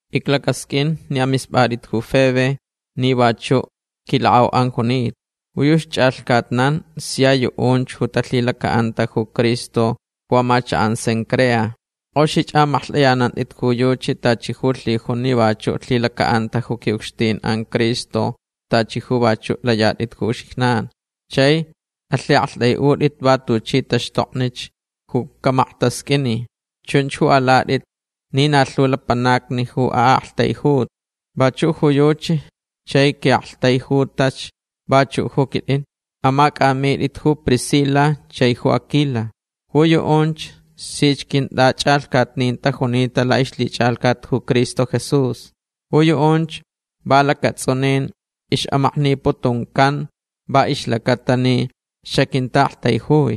Iclacasqʼuin ni amispʼatʼit ju Febe ni vachuch quilakʼauʼan junita. Ju yuchi chʼalhcatnan sia yuʼunch ju talhilacaʼanta ju Cristo ju amachakʼan Cencrea. Kʼoxich amaklhtʼaʼitʼit ju yuchi tachi ju lhijun ni vachuʼ lhilacaʼanta ju quiʼucxtinʼan Cristo tachi ju vachuʼ layatʼit ju uxijnan. Chai alhiʼaktʼaiʼutʼitch va tuchi taxtoknich ju camaktasqʼuinilh. Chunch ju alatʼit ni na lhu lapanacni ju aʼaktaijutach vachuʼ ju yuchi chai quiʼaktaijutach vachuʼ ju quitʼin. Amacʼamitʼitch ju Priscila chai ju Aquila. Ju yuʼunch sich quintʼachʼalhcatnin tajunita laʼixlhichʼalhcat ju Cristo Jesús. Ju yuʼunch va lacatsʼuninch ixʼamakniputuncan va ixlacaʼatalh ni xaquintaʼaktaijui.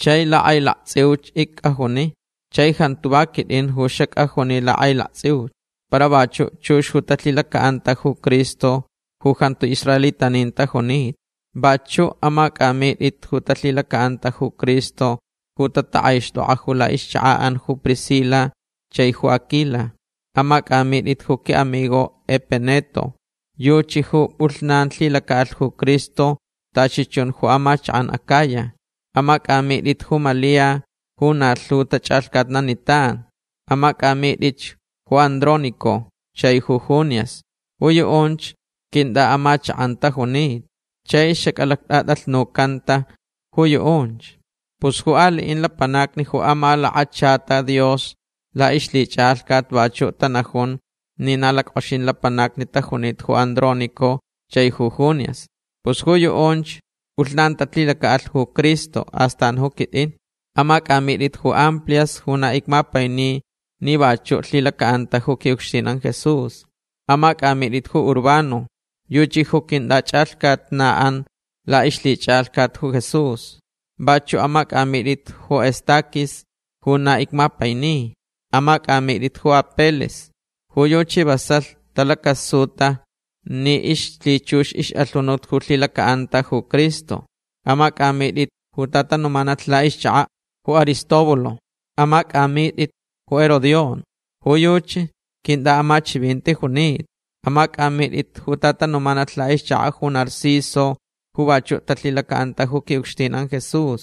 Chai lakʼailaktsʼiuch icʼajuni. Chai jantu va quitʼin ju xacʼajuni lakʼailaktsʼiuch. Para vachuʼ chux ju talhilacaʼantach ju Cristo ju jantu israelitanin tajunita. Vachuʼ amacʼamitʼit ju talhilacaʼanta ju Cristo ju tatakʼaixtʼokʼa ju laʼixchakaʼan ju Priscila chai ju Aquila. Amacʼamitʼitch ju quiʼamigo Epeneto. Yuchi ju pʼulhnan lhilacaʼalh ju Cristo tachi chun ju amachakʼan Acaya. Amacʼamitʼitch ju Malia ju na lhu tachʼalhcatnanitan. Amacʼamitʼitch ju Andrónico chai ju Junias. Ju yuʼunch quintʼaʼamachakʼan tajunita. Chai xacʼalactʼatʼalhnucanta ju yuʼunch. Pus ju aliʼin lapanacni ju amalakachata Dios laʼixlhichʼalhcat vachuʼ tanajun ni na lackʼoxin lapanacni tajunita ju Andrónico chai ju Junias. Pus ju yuʼunch pʼulhnan talhilacaʼalh ju Cristo. Astan ju quitʼin. Amacʼamitʼit ju Amplias ju na icmapaini ni vachuʼ lhilacaʼanta ju quiʼucxtinʼan Jesús. Amacʼamitʼitch ju Urbano. Yuchi ju quintʼachʼalhcatnaʼan laʼixlhichʼalhcat ju Jesús. Vachuʼ amacʼamitʼitch ju Estaquis ju na icmapaini. Amacʼamitʼitch ju Apeles. Ju yuchi vasalh talacasuta ni ixlhichux ixʼalhunut ju lhilacaʼanta ju Cristo. Amacʼamitʼitch ju tatanumanalh laʼixchakaʼ ju Aristóbulo. Amacʼamitʼitch ju Herodión. Ju yuchi quintʼaʼamachivinti junita. Amacʼamitʼitch ju tatanumanalh laʼixchakaʼ ju Narciso ju vachuʼ talhilacaʼanta ju quiʼucxtinʼan Jesús.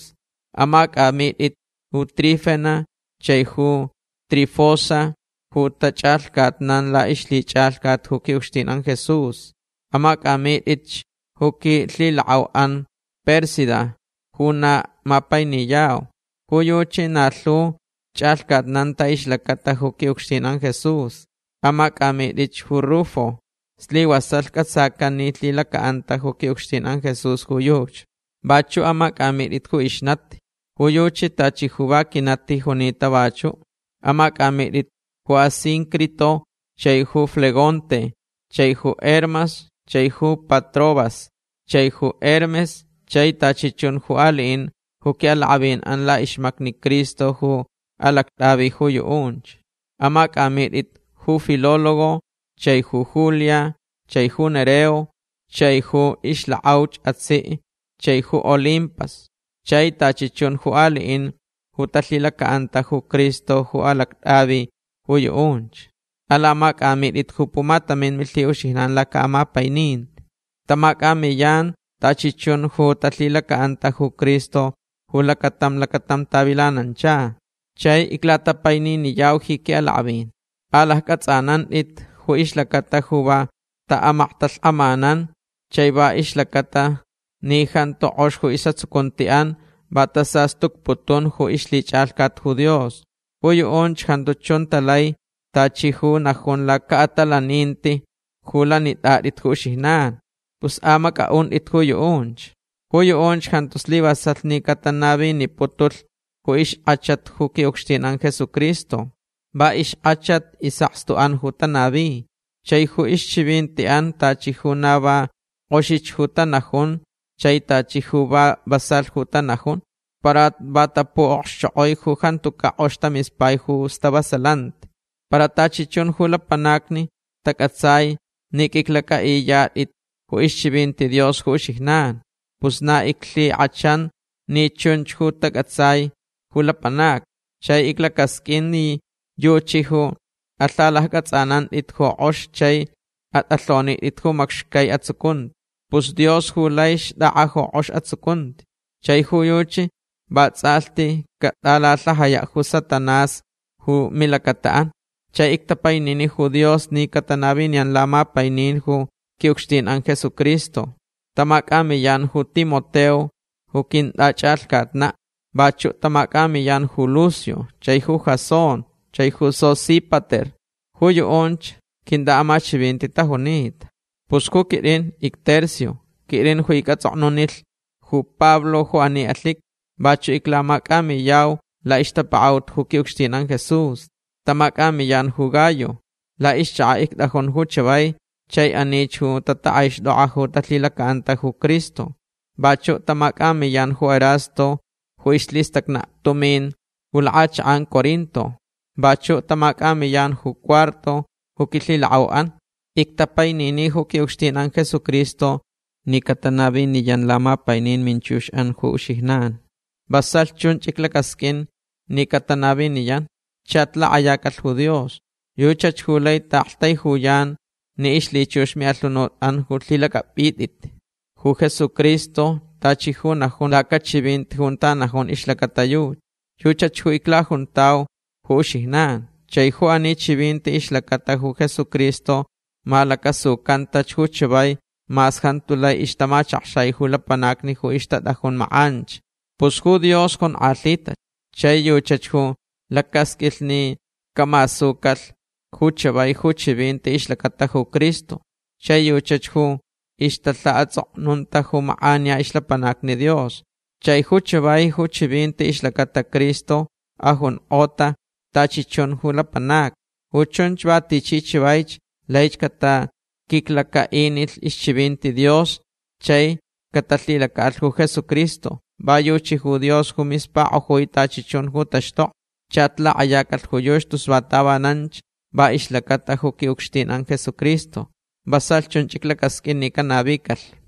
Amacʼamitʼit ju Trifena chai ju Trifosa ju tachʼalhcatnan laʼixlhichʼalhcat ju quiʼucxtinʼan Jesús. Amacʼamitʼitch ju quilhilakʼauʼan Pérsida ju na mapainiyau. Ju yuchi na lhu chʼalhcatnanta ixlacata ju quiʼucxtinʼan Jesús. Amacʼamitʼitch ju Rufo. Slivasalh cʼatsacan ni lhilacaʼanta ju quiʼucxtinʼan Jesús ju yuchi. Vachuʼ amacʼamitʼitch ju ixnati. Ju yuchi tachi ju va quinati junita vachuʼ. Amacʼamitʼitch ju Asíncrito chai ju Flegonte chai ju Hermas chai ju Patrobas chai ju Hermes chai tachi chun ju aliʼinch ju quiʼalakʼavinʼan laʼixmacni Cristo ju alactʼavi ju yuʼunch. Amacʼamitʼit ju Filólogo chai ju Julia chai ju Nereo chaich ju ixlakʼauch atsiʼ chaich ju Olimpas chai tachi chun ju aliʼin ju talhilacaʼanta ju Cristo ju alactʼavi ju yuʼunch. Alamacʼamitʼit ju pumatamin milhiʼuxijnan lacaʼamapaininti. Tamacʼamiyanch tachi chun ju talhilacaʼanta ju Cristo ju lacatam lacatam tavilanancha. Chai iclatapaininiyau ji quiʼalakʼavin. Alaccʼatsʼanantʼit ju ixlacata ju va taʼamaktalhkʼamanan chai va ixlacata ni jantu kʼox ju isʼatsucuntiʼan va tasastucputun ju ixlhichʼalhcat ju Dios. Ju yuʼunch jantu chun talai tachi ju najun lacaʼatalaninti ju lanitʼatʼit ju uxijnan. Pus amacʼaʼuntʼit ju yuʼunch. Ju yuʼunch jantu slivasalh ni catanaviniputulh ju ixkʼachat ju quiʼucxtinʼan Jesucristo. Va ixkʼachat isʼakstuʼan ju tanavi. Chai ju ixchivintiʼan tachi ju na va kʼoxich ju tanajun chai tachi ju va vasalh ju tanajun. Para va tapuʼokxchokʼoi ju jantucaʼ kʼox tamispai ju stavasalanti. Para tachi chun ju lapanacni tacʼatsai ni qʼuiclacʼaʼiyatʼitch ju ixchivinti Dios ju uxijnan. Pus na iclhikʼachanch ni chun ju tacʼatsai ju lapanacni. Chai iclacasqʼuinch ni yuchi ju alhalaccʼatsʼanantʼit ju kʼox chai atʼalhonitʼit ju macxcai atsucunti. Pus Dios ju lai xtʼakʼa ju kʼox atsucunti. Chai ju yuchi vatsʼalhti catʼalalhajayaʼ ju Satanás ju milacataʼan. Chai ictapainini ju Dios ni catanaviniyan lamapainin ju quiʼucxtinʼan Jesucristo. Tamacʼamiyan ju Timoteo ju quintʼachʼalhcatnaʼ. Vachuʼ tamacʼamiyan ju Lucio chai ju Jasón chai ju Sosípater. Ju yuʼunch quintʼaʼamachivinti tajunita. Pus ju quitʼin icTercio. Quitʼin ju icʼatsʼoknunilh ju Pablo ju ani alhiqui. Vachuʼ iclamacʼamiyau laʼixtapakaʼut ju quiʼucxtinʼan Jesús. Tamacʼamiyan ju Gayo. Laʼixchakaʼ ictʼajun ju chavai chai anich ju tatakʼaixtʼokʼa ju talhilacaʼanta ju Cristo. Vachuʼ tamacʼamiyan ju Erasto ju ixlhistacnaʼ tumin ju lakʼachakʼan Corinto. Vachuʼ tamacʼamiyan ju Cuarto ju quilhilakʼauʼan. Ictapainini ju quiʼucxtinʼan Jesucristo ni catanaviniyan lamapainin minchuxʼan ju uxijnan. Vasalh chunch iclacasqʼuin ni catanaviniyan. Chach lakʼayacalh ju Dios. Yuchach ju lai taʼaktaijuyan ni ixlhichux miʼalhunutʼan ju alhilacʼapʼitʼitch ju Jesucristo tachi ju najun lacachivinti junta najun ixlacata yuchi. Yuchach ju iclajuntauch ju uxijnan. Chai ju ani chivinti ixlacata ju Jesucristo malacasucantach ju chavai mas jantu lai ixtamachakxai ju lapanacni ju ixtatʼajun makʼanch. Pus ju Dios jonkʼalhitach. Chai yuchach ju lacasqʼuilh ni camasucalh ju chavai ju chivinti ixlacata ju Cristo. Chai yuchach ju ixtalhaʼatsʼoknunta ju makʼaniya ixlapanacni Dios. Chai ju chavai ju chivinti ixlacata Cristo ajunkʼota tachi chun ju lapanacni. Ju chunch va tichi chavaich laich cataquiclacaʼinilh ixchivinti Dios chai catalhilacaʼalh ju Jesucristo. Va yuchi ju Dios ju mispakʼojui tachi chun ju taxtokni. Chach lakʼayacalh ju yuchi tus va tavananch va ixlacata ju quiʼucxtinʼan Jesucristo. Vasalh chunch iclacasqʼuin ni canavicalh.